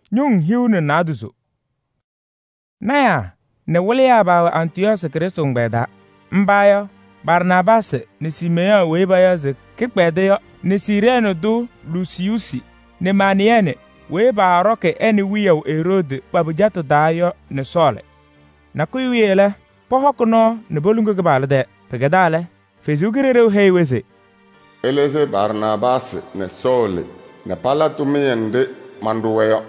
Lɔɔyɩsɩ tɩnaa nɛ wɩlɩyaa paawɛ Antɩyɔɔsɩ Krɩstʋ ɛgbɛyɛ taa. Mba yɔ: Barnaabaasɩ nɛ Siimeyɔɔ weyi payaɣ se Kɩkpɛdʋ yɔ nɛ Siirɛɛnɩ tʋ Lusiyuusi nɛ Manayɛɛnɩ weyi paaɖɔkɩ ɛ nɛ wiyaʋ Eroodi pa-pɩcatʋ taa yɔ nɛ Sɔɔlɩ. Nakʋyʋ wiye lɛ, pɔhɔkɩ nɔɔ nɛ poluŋuu Kɩpaɣlʋ tɛɛ. Pɩkɛdaa lɛ, Ɛsɔ Kalɩzaɣ heyi-wɛ se: “Ɩlɩzɩ Barnaabaasɩ nɛ Sɔɔlɩ nɛ pala tʋmɩyɛ nɖɩ manɖʋ-wɛ yɔ.”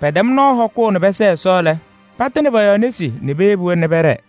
Pɛtɛm nɔɔ hɔkʋʋ nɛ pɛsɛɛ Ɛsɔ lɛ, patɩnɩ pɔ-yɔɔ nesi nɛ peyebi-wɛ nɛ pɛɖɛɛ.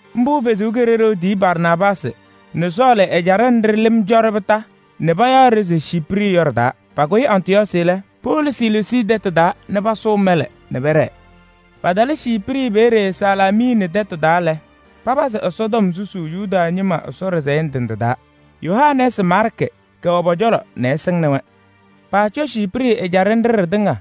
Mbʋ Ɛsɔ Kalɩzaɣ tiyi Barnaabaasɩ nɛ Sɔɔlɩ ɛjaɖɛ nɖɩ lɩm cɔ-ɖɩ kondiko nɛ payaɣ-ɖɩ se Ciiprɩ yɔ ɖɩ-taa. Pakʋyɩ Antɩyɔɔsɩ lɛ, powolo Selesii tɛtʋ taa nɛ pasʋʋ mɛlɛ nɛ pɛɖɛɛ. Patalɩ Ciiprɩ peeye Salaamiini tɛtʋ taa lɛ, papazɩ Ɛsɔtɔm susuu Yuda ñɩma Ɛsɔ ɖɩsɛyɛ ndɩ ndɩ taa. Yohanɛɛsɩ Maarkɩ kɛwɛ pɔ-cɔlɔ nɛ ɛsɩŋnɩ-wɛ. Paacɔ Ciiprɩ ɛjaɖɛ nɖɩ ɖɩtɩŋa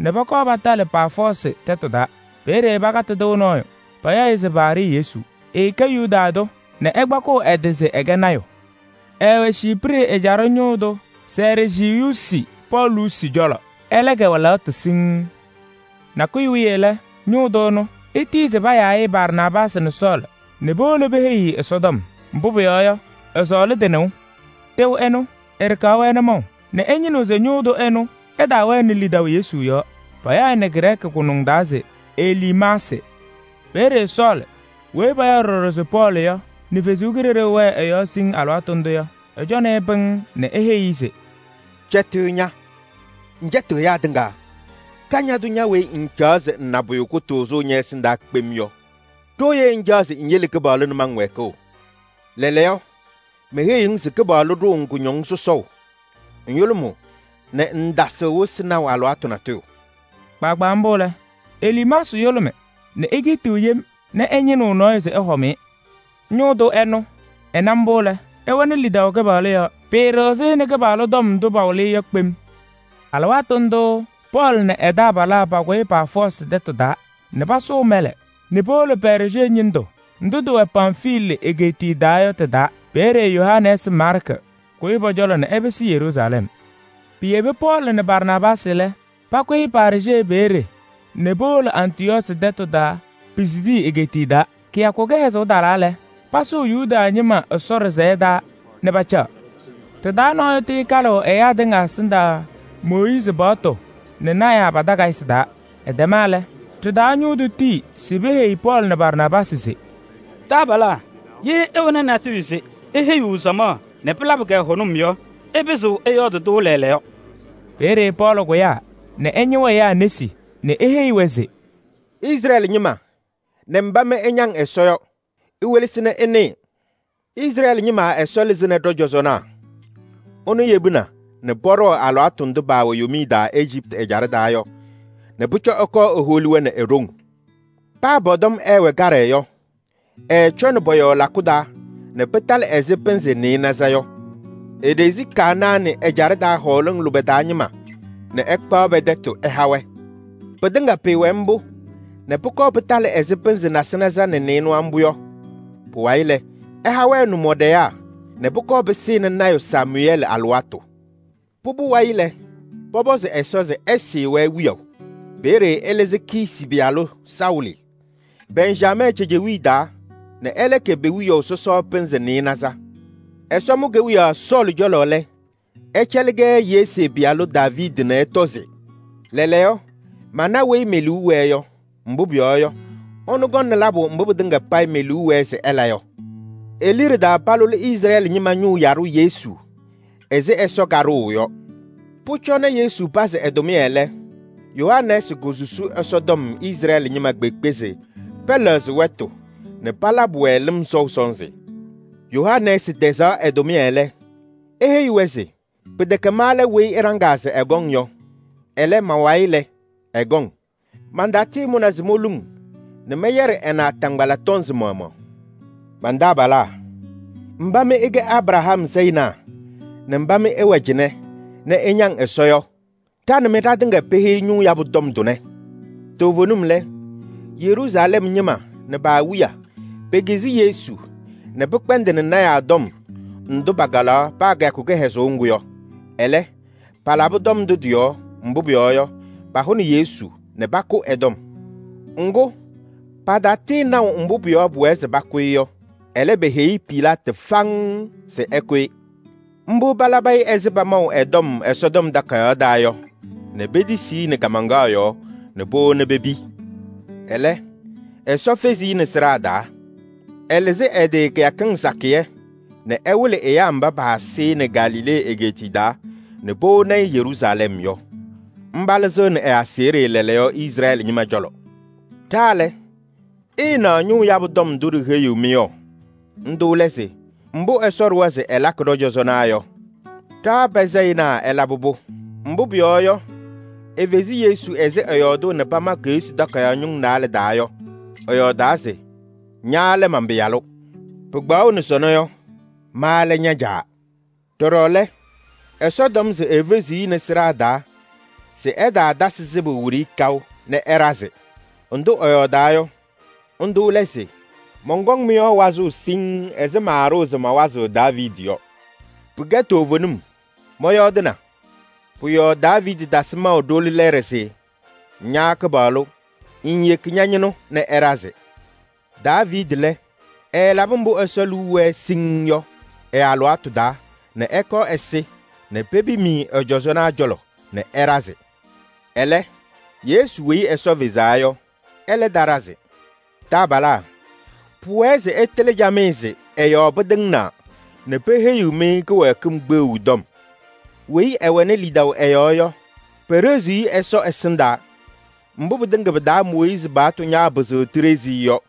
nɛ pɔkɔɔ patalɩ Paafɔɔsɩ tɛtʋ taa. Peeye pakatɩ tɩʋ nɔɔyʋ, payaɣ-ɩ se Baarɩ-Yesu. Ɛɛkɛ Yuda tʋ nɛ ɛkpakɩɣ ɛ-tɩ se ɛkɛ lɔɔyaɣ tʋ. Ɛɛwɛ Ciiprɩ ɛjaɖɛ ñʋʋ tʋ Sɛrjiyuusi Pɔɔlusi cɔlɔ, ɛlɛ kɛwɛ lɛɣtʋ. Nakʋyʋ wiye lɛ, ñʋʋ tʋ ɛnʋ, etiyi se payaa-ɩ Barnaabaasɩ nɛ Sɔɔlɩ nɛ powolo peheyi-i Ɛsɔtɔm, mbʋ pʋyɔɔ yɔ, ɛsɔɔlɩ tɩ-nɩʋ. Tɩʋ ɛnʋ, ɛɖɩkaɣ-wɛ nʋmɔʋ nɛ ɛñɩnɩɣ se ñʋʋ tʋ ɛnʋ ɛtaawɛnɩ lidaʋ Yesu yɔɔ. Payaɣ-ɩ nɛ Grɛɛkɩ taa se: Eliimaasɩ. Peeye Sɔɔlɩ weyi payaɣ ɖɔɖɔ se Pɔɔlɩ nɛ Ɛsɔ Kalɩzaɣ wɛ ɛ-yɔɔ siŋŋ alɩwaatʋ ndʋ yɔ, ɛcɔnɩ-ɩ pɩŋŋ nɛ eheyi-i se: “Eluukenu aji lɔŋ tʋ kañadʋ weyi ña ŋŋcaɣ se ŋna pʋyʋ kʋtʋʋzʋ ñɛ-ɛsɩndaa kpem yɔ! Ɖooye ŋcaɣ se ŋyele Kɩpaɣlʋ nʋmɔŋ wɛɛkʋʋ? Lɛɛlɛɛyɔ, meheyiɣ-ŋ se Kɩpaɣlʋ ɖʋʋ-ŋ kʋñɔŋ sɔsɔʋ: ŋyʋlʋmʋʋ nɛ ŋŋtasɩɣ wɩsɩ naʋ alɩwaatʋ natʋyʋ.” Kpaagbaa mbʋ lɛ, Eliimaasɩ yʋlʋmɩ nɛ ekiitiɣ yem nɛ ɛñɩnɩɣ nɔɔyʋ se ɛhɔm-ɩ. Ñʋʋ tʋ ɛnʋ, ɛna mbʋ lɛ, ɛwɛnɩ lidaʋ Kɩpaɣlʋ yɔɔ. Pɩɩɖɩɣzɩ-ɩ nɛ Kɩpaɣlʋ tɔm ndʋ pawɩlɩ-ɩ yɔ kpem. Alɩwaatʋ ndʋʋ Pɔɔlɩ nɛ ɛ-taabalaa pakʋyɩ Paafɔɔsɩ tɛtʋ taa nɛ pasʋʋ mɛlɛ nɛ powolo Pɛɛrjee ñɩndʋ ndʋ tɩwɛ Pamfilii egeetiye taa yɔ tɩ-taa. Peeye Yohanɛɛsɩ Maarkɩ kʋyɩ pɔ-cɔlɔ nɛ ɛpɩsɩ Yeruusalɛm. Piyebi Pɔɔlɩ nɛ Barnaabaasɩ lɛ, pakʋyɩ Pɛɛrjee peeye nɛ powolo Antɩyɔɔsɩ tɛtʋ taa Pisidii egeetiye taa. Kɩyakʋ kɩhɛzʋʋ talaa lɛ, pasʋʋ Yuda ñɩma Ɛsɔ ɖɩsɛyɛ taa nɛ pacaɣ. Ɖɩ-taa nɔɔyʋ tɩɩkalɩɣ ɛyaa tɩŋa ɛsɩndaa Mooyiizi paɣtʋ nɛ lɔɔyɩsɩ tɩnaa pa-takayɩsɩ taa. Ɛtɛma lɛ, ɖɩ-taa ñʋŋ tɩnaa tiyi se peheyi Pɔɔlɩ nɛ Barnaabaasɩ se: “Taabalaa! Ye ɩwɛnɩ natʋyʋ se iheyiɣ samaɣ nɛ pɩlabɩ-kɛ hʋnʋm yɔ, ɩpɩzɩɣ ɩyɔɔdɩ-tʋ lɛɛlɛɛyɔ.” Peeye Pɔɔlɩ kʋyaa nɛ ɛñɩɣ ɛyaa nesi nɛ eheyi-wɛ se: “Izrɛɛlɩ ñɩma nɛ mba mɩ ɩñaŋ Ɛsɔ yɔ! Iwelesi nɛ ɩnɩɩ: Izrɛɛlɩ ñɩma Ɛsɔ lɩzɩnɩ ɖɔ-cɔzɔnaa. Ɛnʋ yebina nɛ pɔɖɔɔ alɩwaatʋ ndʋ paawɛ yomiye taa Ejiptɩ ɛjaɖɛ taa yɔ nɛ pʋcɔ ɛkɔɔ eholi-wɛ nɛ e-ɖoŋ. Paa pɔ-tɔm ɛɛwɛ kaɖɛ yɔ, ɛɛcɔnɩ pɔ-yɔɔ lakʋ taa nɛ pɩtalɩ ɛzɩ pɩnzɩ nɩɩnaza yɔ. Eɖezi Kanaanɩ ɛjaɖɛ taa hɔɔlɩŋ lʋbɛ taa ñɩma nɛ ɛkpaɣ pɛ-tɛtʋ ɛha-wɛ. Pɩtɩŋa pɩɩwɛ mbʋ nɛ pʋkɔɔ pɩtalɩ ɛzɩ pɩnzɩ nasɩnaza nɛ nɩɩnʋwa mbʋ yɔ. Pʋwayɩ lɛ, ɛha-wɛ nʋmɔɖɛyaa nɛ pʋkɔɔ pɩsɩnɩ lɔɔyaɣ tʋ Samʋyɛɛlɩ alɩwaatʋ. Pʋbʋ wayɩ lɛ, pɔpɔzɩ Ɛsɔ se ɛsɩɩ-wɛ wiyaʋ. Peeye ɛlɩzɩ Kiisi pɩyalʋ Saʋlɩ, Bɛnjamɛɛ cejewiye taa nɛ ɛlɛ kɛ pe-wiyaʋ sɔsɔ pɩnzɩ nɩɩnaza. Ɛsɔ mʋ kewiyaɣ Saʋlɩ cɔlɔ lɛ, ɛcɛlɩ-kɛ Yesee pɩyalʋ Daaviidi nɛ ɛtɔ se: ‘Lɛɛlɛɛyɔ, mana weyi me-liu wɛɛ yɔ, mbʋ pʋyɔɔ yɔ, ɛnʋ kɔŋnɩ labʋ mbʋ pɩtɩŋa payɩ me-liu wɛɛ se ɛla yɔ.’ E-liɖe taa palʋlɩ Izrɛɛlɩ ñɩma ñʋʋ yaɖʋ Yesu ɛzɩ Ɛsɔ kaɖʋʋ yɔ. Pʋcɔ nɛ Yesu pazɩ ɛ-tʋmɩyɛ lɛ, Yohanɛɛsɩ kosusi Ɛsɔtɔm Izrɛɛlɩ ñɩma kpeekpe se pɛlɛɣzɩ wɛtʋ nɛ palabɩ-wɛ lɩm sɔʋ sɔnzɩ. Yohanɛɛsɩ tɛzaɣ ɛ-tʋmɩyɛ lɛ, eheyi-wɛ se: ‘Pɩtɛkɛ ma lɛ weyi ɩɖaŋaa se ɛkɔŋ yɔ. Ɛlɛ, ma-wayɩ lɛ, ɛkɔŋ. Mantatɩɩmʋnɩ se moluŋ nɛ mɛyɛɖɩ ɛ-naataŋgbala tɔnzɩ maɣmaɣ.’ Man-taabalaa, mba mɩ ɩkɛ Abraham sayɩnaa nɛ mba mɩ ɩwɛ cɩnɛ nɛ ɩñaŋ Ɛsɔ yɔ! Ɖa nɛ mɩ ɖatɩŋa peheyi ñʋʋ yabʋ tɔm tʋnɛ. Toovenim lɛ, Yeruusalɛm ñɩma nɛ pa-awiya, pekizi Yesu nɛ pɩkpɛndɩnɩ lɔɔyɩsɩ tɩnaa tɔm ndʋ pakalaɣ paa kɩyakʋ kɩhɛzʋʋ ŋgʋ yɔ. Ɛlɛ, palabɩ tɔm ndʋ tɩ-yɔɔ, mbʋ pʋyɔɔ yɔ, pahʋnɩ Yesu nɛ pakʋ ɛ-tɔm. Ŋgʋ, patatɩɩnaʋ mbʋ pʋ-yɔɔ pʋwɛɛ se pakʋ-ɩ yɔ. Ɛlɛ, peheyi Pilaatɩ faŋŋ se ɛkʋ-ɩ. Mbʋ palabɩ-ɩ ɛzɩ pamaʋ ɛ-tɔm Ɛsɔtɔm Takayaɣ taa yɔ nɛ petisi-i nɛ kaamaŋkaɣ yɔɔ nɛ powoni pepi. Ɛlɛ, Ɛsɔ fezi-i nɛ sɩɖaa taa. Ɛlɩzɩ ɛ-tɩ kɩyakɩŋ sakɩyɛ nɛ ɛwɩlɩ ɛyaa mba paasɩ-ɩ nɛ Galilee egeetiye taa nɛ powoni-i Yeruusalɛm yɔ. Mba lɩzɩɣnɩ ɛ-aseɣɖe lɛɛlɛɛyɔ Izrɛɛlɩ ñɩma cɔlɔ. Ɖa lɛ, ɩɩnaɣ ñʋʋ yabʋ tɔm ndʋ ɖiheyiɣ-mɩ yɔ. Ndʋ lɛ se: mbʋ Ɛsɔ ɖʋwa se ɛlakɩ ɖɔ-cɔzɔnaa yɔ, ɖa pa-sayɩnaa ɛlabɩ-pʋ. Mbʋ pʋyɔɔ yɔ, efezi Yesu ɛzɩ ɛyɔɔdʋʋ nɛ pama Keɣsi Takayaɣ ñʋŋ naalɛ taa yɔ. Ɛyɔɔdaa se: ‘Ña lɛ man-Pɩyalʋ. Pɩkpaɣʋnɩ sɔnɔ yɔ, ma lɛ ña-Caa.’ Ɖɔɖɔ lɛ, Ɛsɔ tɔm se efeziɣ-i nɛ sɩɖaa taa se ɛtaatasɩ sɩbʋ wiɖiyi kaʋ nɛ ɛɖazɩ. Ndʋ ɛyɔɔdaa yɔ, ndʋ lɛ se: ‘Mɔnkɔŋ wazʋʋ mɩ-yɔɔ siŋŋ ɛzɩ maaɖʋʋ se mawazɩɣ Daaviidi yɔɔ yɔ. Pɩkɛ toovenim, mɔyɔɔdɩna.’ Pʋ-yɔɔ Daaviidi tasɩ maʋ ɖoli lɛɛɖɛ se: ‘Ña Kɩpaɣlʋ, ŋŋyeki ña-ñɩnʋ nɛ ɛɖazɩ.’ Daaviidi lɛ, ɛɛlabɩ mbʋ Ɛsɔ liu wɛɛ siŋŋ yɔ ɛ-alɩwaatʋ taa nɛ ɛkɔɔ ɛsɩ nɛ pepim-i ɛ-cɔzɔnaa cɔlɔ nɛ ɛɖazɩ. Ɛlɛ, Yesu weyi Ɛsɔ fezaa yɔ, ɛlɛ taɖazɩ. Taabalaa! Pʋwɛɛ se ɩtɩlɩ camɩyɛ se ɛ-yɔɔ pɩtɩŋnaa nɛ peheyiɣ-mɩ kɩwɛɛkɩm kpeɣu tɔm. Weyi ɛwɛnɩ lidaʋ ɛ-yɔɔ yɔ, peɖeziɣ-i Ɛsɔ ɛsɩndaa mbʋ pɩtɩŋa pɩ-taa Mooyiizi paɣtʋ ñaapɩzɩɣ tiɖezi-i yɔ.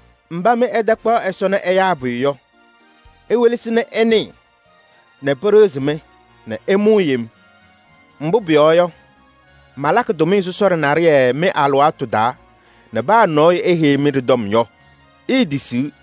‘Mba mɩ ɩtakpaɣ Ɛsɔ nɛ ɛyaa pʋyʋ yɔ, iwelesi nɛ ɩnɩɩ nɛ pɩɖɩɣzɩ-mɩ nɛ ɩmʋʋ yem! Mbʋ pʋyɔɔ yɔ, malakɩ tʋmɩyɛ sɔsɔɖɛ naɖɩyɛ mɩ-alɩwaatʋ taa nɛ paa nɔɔyʋ eheyi-mɩ ɖɩ-tɔm yɔ, iitisiɣ.’”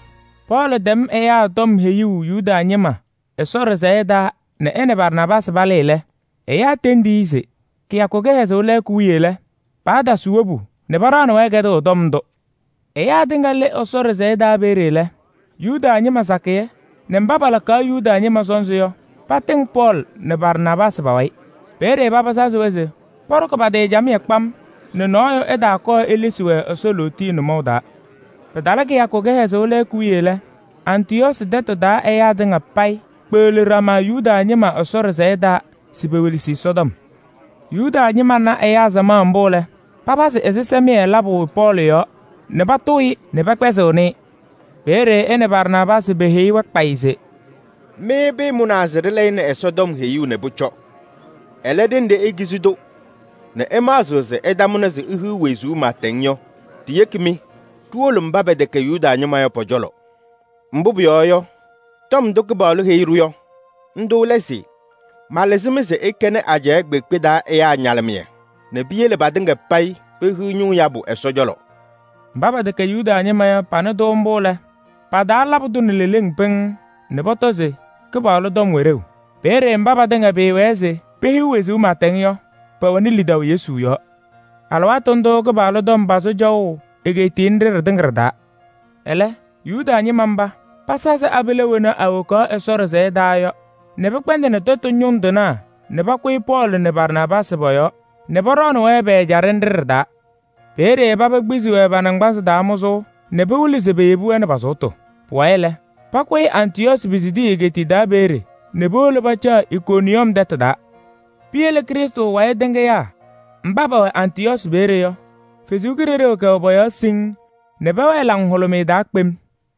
Pɔɔlɩ tɛm ɛyaa tɔm heyuu Yuda ñɩma Ɛsɔ ɖɩsɛyɛ taa nɛ ɛ nɛ Barnaabaasɩ palɩɩ lɛ, ɛyaa tendi-wɛ se: kɩyakʋ kɩhɛzʋʋ lɛɛkʋ wiye lɛ, paatasɩ wobu nɛ paɖaɣnɩ-wɛ kɛdʋʋ tɔm ndʋ. Ɛyaa tɩŋa lɩ Ɛsɔ ɖɩsɛyɛ peeye lɛ, Yuda ñɩma sakɩyɛ nɛ mba palakaɣ Yuda ñɩma sɔnzɩ yɔ, patɩŋ Pɔɔlɩ nɛ Barnaabaasɩ pa-wayɩ. Peeye paba sazɩ-wɛ se pɔɖɔkɩ pa-tɩ camɩyɛ kpam nɛ nɔɔyʋ ɛtaakɔɔ elesi-wɛ Ɛsɔ lootiye nʋmɔʋ taa. Pɩtalɩ kɩyakʋ kɩhɛzʋʋ lɛɛkʋ wiye lɛ, Antɩyɔɔsɩ tɛtʋ taa ɛyaa tɩŋa payɩ kpeɣli ɖama Yuda ñɩma Ɛsɔ ɖɩsɛyɛ taa se pewelesi Ɛsɔtɔm. Yuda ñɩma na ɛyaa samaɣ mbʋ lɛ, papazɩ ɛzɩsɛmɩyɛ labʋ Pɔɔlɩ yɔɔ nɛ patʋʋ-ɩ nɛ pɛkpɛzɩɣnɩ-ɩ. Peeye ɛ nɛ Barnaabaasɩ peheyi-wɛ kpayɩ se: “Mɩ pɩɩmʋnaa se ɖɩlɛyɩnɩ Ɛsɔtɔm heyuu nɛ pʋcɔ. Ɛlɛ, ɖenɖe ikizi-tʋ nɛ ɩmaɣzɩɣ se ɩtamʋnɩ se ihiɣ wezuu pɩɩtɛŋ yɔ, ɖiyeki-mɩ ɖiwolo mba pɛtɛkɛ Yuda ñɩma yɔ pɔ-cɔlɔ. Mbʋ pʋyɔɔ yɔ, tɔm ndʋ Kɩpaɣlʋ heyi-ɖʋ yɔ, ndʋ lɛ se: ‘Malɩzɩ-mɩ se ɩkɛnɩ ajɛɛ kpeekpe taa ɛyaa ñalɩmɩyɛ nɛ piyele patɩŋa payɩ pehiɣ ñʋʋ yabʋ.’” Mba pɛtɛkɛ Yuda ñɩma yɔ, panɩ-tʋ mbʋ lɛ, pa-taa labɩ-tʋ nɛ leleŋ pɩŋŋ nɛ pɔtɔ se Kɩpaɣlʋ tɔm wɛ ɖeu. Peeye mba patɩŋa pɩɩwɛɛ se pehiɣ wezuu pɩɩtɛŋ yɔ, pɛwɛnɩ lidaʋ Yesu yɔɔ. Alɩwaatʋ ndʋʋ Kɩpaɣlʋ tɔm pazɩ cɔʋ egeetiye nɖɩ ɖɩtɩŋa ɖɩ-taa. Ɛlɛ, Yuda ñɩma mba, pasazɩ abila wena awokaɣ Ɛsɔ ɖɩsɛyɛ taa yɔ nɛ pɩkpɛndɩnɩ tɛtʋ ñʋŋ tɩnaa nɛ pakʋyɩ Pɔɔlɩ nɛ Barnaabaasɩ pɔ-yɔɔ nɛ pɔɖɔɔnɩ-wɛ pɛ-ɛjaɖɛ nɖɩ ɖɩ-taa. Peeye paba kpizi-wɛ pa-naŋgbanzɩ taa mʋzʋʋ nɛ pɩwɩlɩ se peyebi-wɛ nɛ pa-sʋʋtʋ. Pʋwayɩ lɛ, pakʋyɩ Antɩyɔɔsɩ Pisidii egeetiye taa peeye nɛ powolo pacaɣ Ikoniyɔm tɛtʋ taa. Piyele Krɩstʋ wayɩ tɩŋɩyaa mba pɛwɛ Antɩyɔɔsɩ peeye yɔ, Ɛsɔ Kalɩzaɣ kɛwɛ pɔ-yɔɔ siŋŋ nɛ pɛwɛɛ laŋhʋlʋmɩyɛ taa kpem.